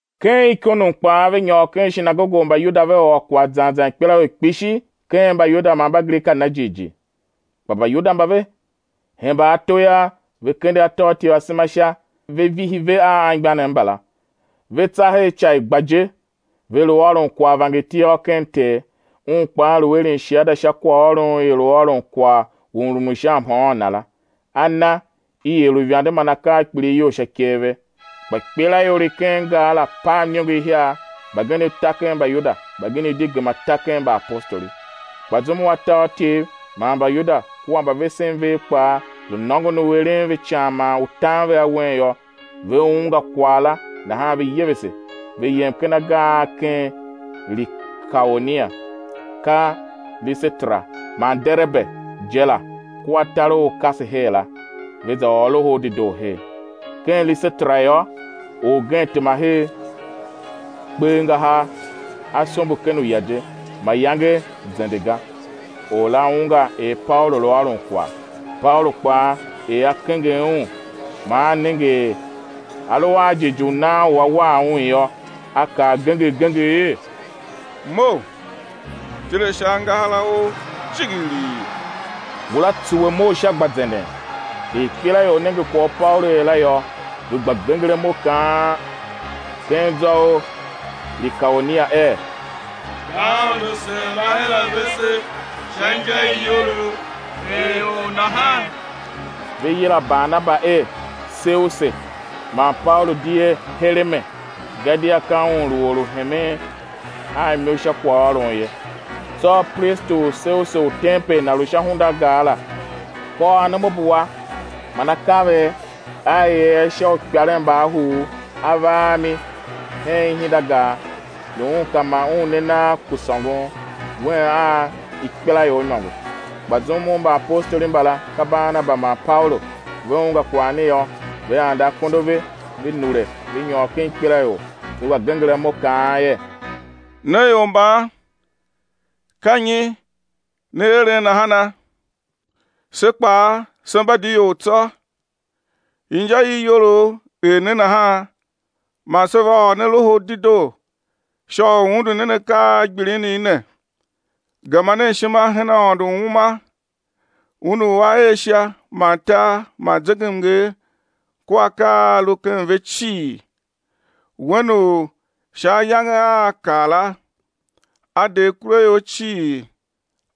Ken Ikonium kpaa ve nyôr ken shinagoge u Mbayuda ve ôr kwagh zan zan ikpelaior kpishi ken Mbayuda man Mbagrika na jighjigh. Kpa Mbayuda mba ve hemba ato yô, ve kende atôatyev asema sha, ve vihi ve a anmgbianev mbala. Ve tsa her ica i gba je, ve lu ôron kwagh vangertiôr ken Ter; Un kpaa lu eren shiada sha kwaghôron u i lu ôron kwagh u mrumun u sha mhôôn Na la, A na i er uivande man akaa a kpilighyol sha ikev ve. Kpa ikpelaior i ken gar la pav iniongo ihiar, mbagenev ta ken Mbayuda, mbagenev di gema ta ken mbaapostoli. Kpa zum u atôatyev man Mbayuda kua mbavesen vev kpaa lu nôngon u eren ve ican man u tan ve awen yô, ve ungwa kwagh la nahan ve yevese, ve yem ken agar a ken Likaonia, ka Lisetera man Derebe je la kua tar u u kase her la, ve za ôr Loho u Dedoo her. Ken Lisetera yô, orgen tema her, kpe angahar, a sombo ken uya je, mayange zende ga. Or la ungwa er Paulu lu ôron kwagh; Paulu kpaa er a kenger un man a nenge er a lu a jighjigh u nan u á war un yô, a kaa genger genger er: Mough, tile sha angahar a ou jighjigh! Ngula tsuwe mough sha gba zenden. Er ikpelaior nenge kwagh u Paulu er la yô, ve gba genger imo kaan ken zwa u Likaonia er: Mbaaôndo sen va her a vese sha inja i iyolough er ior nahan. Ve yila Barnaba er Seuse man Paulu di er Hereme, gadia ka un lu or u hemen a imo sha kwaghôron ye. Tsô pristi u Seuse u tempel na lu sha hunda u gar la, kôr anomabua man akaver a i er a sha uikparen mba ahuuv, a va a mi hen ihindagar, lu un ka ma un ne nagh ku sôngon, wen a ikpelaior imôngo. Kpa zum u mbaapostoli mbala, ka Barnaba man Paulu, ve ungwa kwagh ne yô, ve ande akondo a ve, ve nure, ve nyôr ken ikpelaior, ve gba genger imo, kaan er: Ne ior mban, ka nyi ne eren nahana? Se kpaa se mba di ior tsô, inja i iyolough er ne nahan man se va ôr ne Loho u Dedoo sha u undu nen akaa a gbilinigh ne, gema nen ishima hen Aôndo u uma, Un u A er Sha man tar man zegemnger kua akaa a a lu ken ve cii; Wen u sha ayange a a kar la, A de akuraior cii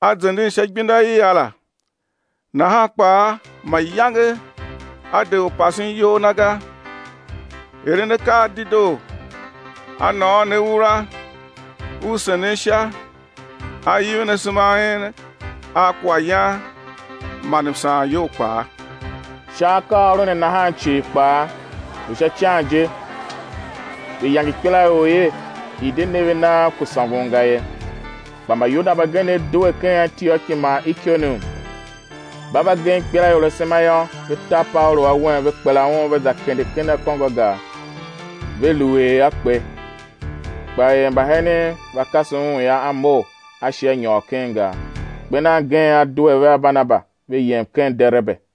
a zenden sha igbenda i a la. Nahan kpaa mayange A de u pasen iyol Na ga, eren akaa a dedoo, A nôôn ne ura u senen sha, A ivin asema a en a kwaghyan man msaanyol kpaa. Sha akaaôron ne nahan cii kpaa, lu sha ican je, ve yange ikpelaior er i̱ de ne ve nagh ku sôngon ga ye. Kpa Mbayuda mbagenev due ken Antioki man Ikonium, mba va gem ikpelaior asema yô, ve ta Paulu awen, ve kpela un, ve za kende ken akôngo a gar, lu ve er a kpe. Kpa er mbahenen va kase un yô, a mough, a shi a nyôr ken gar. Kper nan gen A due vea Barnaba, ve yem ken Derebe.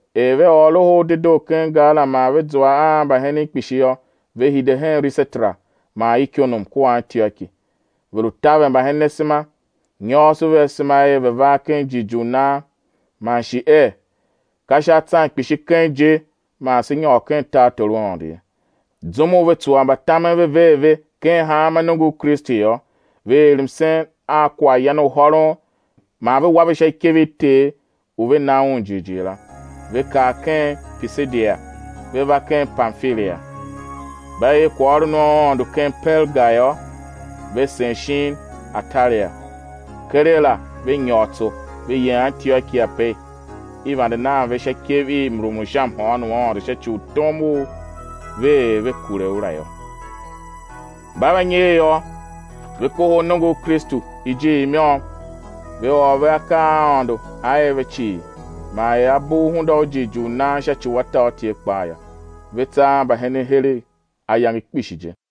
Er ve ôr Loho u Dedoo ken gar la man ve zua a mbahenen kpishi yô, ve hide hen Lisetera man Ikonium kua Antioki. Ve lu taver mbahenen asema, nyôôso ve asema er ve̱ var ken jighjigh u nan, man shi er: Ka sha atsan kpishi keng je man sé nyôr ken tartor u Aôndo ye. Zum u ve tsuwa mbatamen ve ver ve ken hanma nongo u Kristu yô, ve er msen a kwaghyan u hôron man ve wa ve sha ikev i Ter u ve na Un jighjigh la. Ve kar ken Pishidia, ve va ken Pamfilia. Mba er kwaghôron u Aôndo ken Perga yô, ve sen shin Atalia. Keregh la ve nyôr tso, ve yem Antioki ape i vande nan ve sha ikev i mrumun u sha mhôôn u Aôndo sha ci u tom u ve er ve kure u la yô. Mba va nyer yô, ve kohol nongo u Kristu ijiir i môm, ve ôr ve akaa a Aôndo A er ve cii, man er A bugh hunda u jighjigh u nan sha ci u atôatyev kpaa yô. Ve tsa a mbahenen heregh ayange kpishi je.